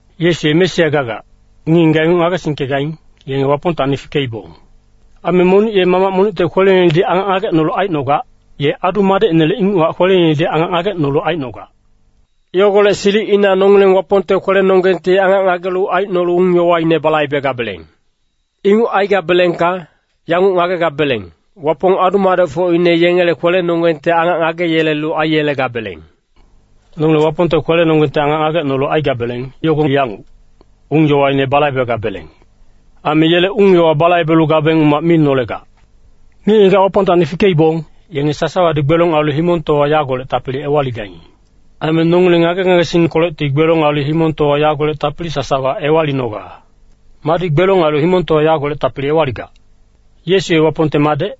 Yesu ye Mesia gagac, ngic-ngigac inguc ngagesingkegaing, yenge Wapongtacni fikeibong. Aime monic ye mamac monicte kweleinedi angac ngagecnolu aicnogac, ye adu-madecinele inguchac kweleinedi angac ngagecnolu aicnogac. Yogolec silicina nongileng Wapongte kwelenonggengti angac ngagelu aicnolu ung-yowaine balaibegabeleng. Inguc aigabelengka, yanguc ngagegabeleng, Wapong adu-madecfocine yengele kwelenongenggti angac ngageyelelu aiyelegabeleng. Nongileng Wapongte kwelenonggengti angac ngagecnolu aigabeleng, yogo yanguc, ung-yowaine balaibegabeleng. Aime yele ung-yowa balaibelu gabeng umac mi nolegac. Ngic-ngigac Wapongtacni fikeibong, yenge sasawadi gbelong ailu himongtowa yagolec tapili ewaligaing. Aime nongileng ngage-ngagesingkolecti gbelong ailu himongtowa yagolec tapili sasawa ewalinoga. Madi gbelong ailu himongtowa yagolec tapili ewaligac? Yesu ye Wapongte Madec.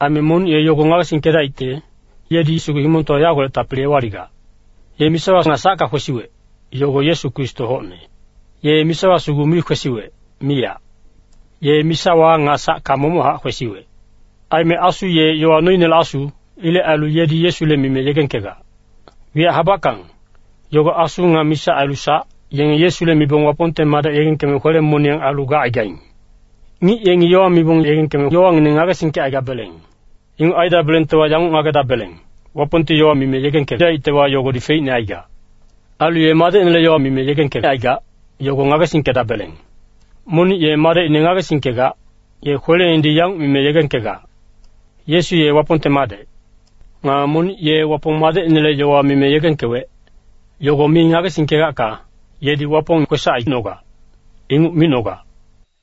Aime monic ye yogo ngagesingkedaicte, yedi sugu himongtowa yagolec tapili ewaligac. Ye misawa nga sacka kwesiwec, yogo Yesu Kristo hocne. Ye misawa sugu mi kwesiwec, miyac. Ye misawa nga sacka momochac kwesiwec. Aime Asu ye yowa noinele Asu. Ilec ailu yedi Yesule mime yegengkegac. Wiyac habackang, yogo Asu nga misa ailu sac, yenge Yesule mibong Wapongte Madec yegengkeme kwele-moniyang ailu gacaigaing. Ngic yengi yowa mibong yegengkeme yowangineng ngagesingkecaigabeleng. Inguc aidabelengtewa, yanguc ngagedabeleng, Wapongti yowa mime yegengkedaictewa, yogodi feicne aigac. Ailu ye Madecinele yowa mime yegengkecaigac, yogo ngagesingkedabeleng. Monic ye Madecine ngagesingkegac, ye kweleinedi yanguc mime yegengkegac, “Yesu ye Wapongte Madec.” Nga monic ye Wapong Madecinele yowa mime yegengkewec, yogo mi ngagesingkegacka, yedi Wapong kwesac aicnogac, inguc micnogac.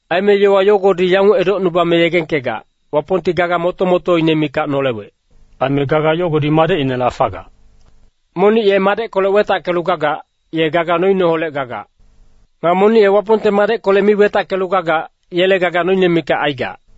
Aime yowa yogodi yanguc edocnubame yegengkegac, Wapongti gaga moto-motoine mikac nolewec. Aime gaga yogodi Madecinela fagac. Monic ye Madeckolec wetackelu gagac, ye gaga noineholec gagac. Nga monic ye Wapongte Madeckolec mi wetackelu gagac, yele gaga noine mikac aigac.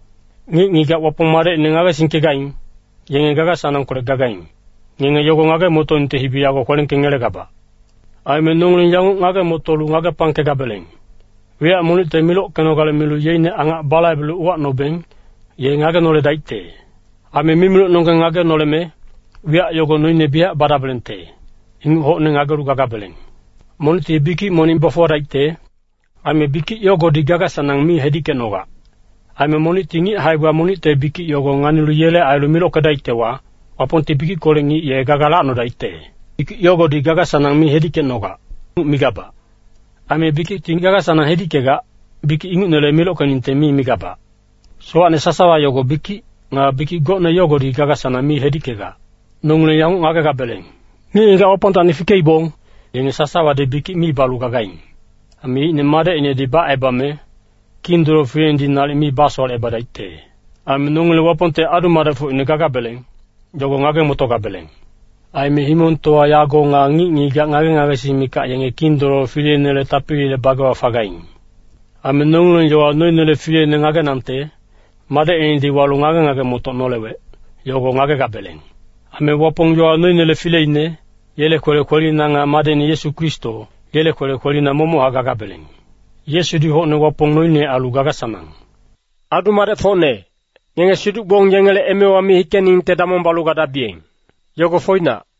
Ngic-ngigac Wapong Madecine ngagesingkegaing, yenge gaga-sanangkolec gagaing, ngenge yogo ngage-motoningte hibi yago kwelengkengelegabac. Aime nongileng yanguc ngage-motolu ngagepangkegabeleng, wiyac monicte milockenogale milu yeicne angac balaibelu uwacnobeng, ye ngagenoledaicte. Aime mimilocnonggeng ngagenoleme, wiyac yogo noine biyac badabelengte, inguc hocne ngagelu gagabeleng. Monicti bikic monic bafuwadaicte, aime bikic yogodi gaga-sanang mi hedickecnogac. Aime monicti ngic hae-gba monicte bikic yogo nganilu yele ailu milockedaictewa, Wapongti bikickolec ngic ye gaga lacnodaicte. Bikic yogodi gaga-sanang mi hedickecnogac, inguc migabac. Aime bikicti gaga-sanang hedickegac, bikic ingucnele milockeningte mi migabac. Sowacne sasawa yogo bikic, nga bikic gocne yogodi gaga-sanang mi hedickegac. Nongileng yanguc ngagegabeleng, ngic-ngigac Wapongtacni fikeibong, yenge sasawadi bikic mi balu gagaing. Aime yeicne Madecinedi bacebame, Kindololo fileinedi nalic mi basowalecebadaicte. Aime nongileng Wapongte adu-madecfocine gagabeleng, yogo ngage-motogabeleng. Aime himongtowa yago nga ngic-ngigac ngage-ngagesing mikac yenge Kindololo fileinele tapilile bagewa fagaing. Aime nongileng yowa noinele Fileine ngagenangte, Madecinedi walu ngage-ngage-motoc nolewec, yogo ngagegabeleng. Aime Wapong yowa noinele fileine, yele kwele kwelina nga Madecine Yesu Kristo, yele kwele kwelina momochac gagabeleng. Yesudi hocne Wapong noine ailu gaga-sanang. Adu-madecfocne, ngenge siduc-gbong yengele emewa mi hikeningte damong balu gadabiyeng. Yogo foinac.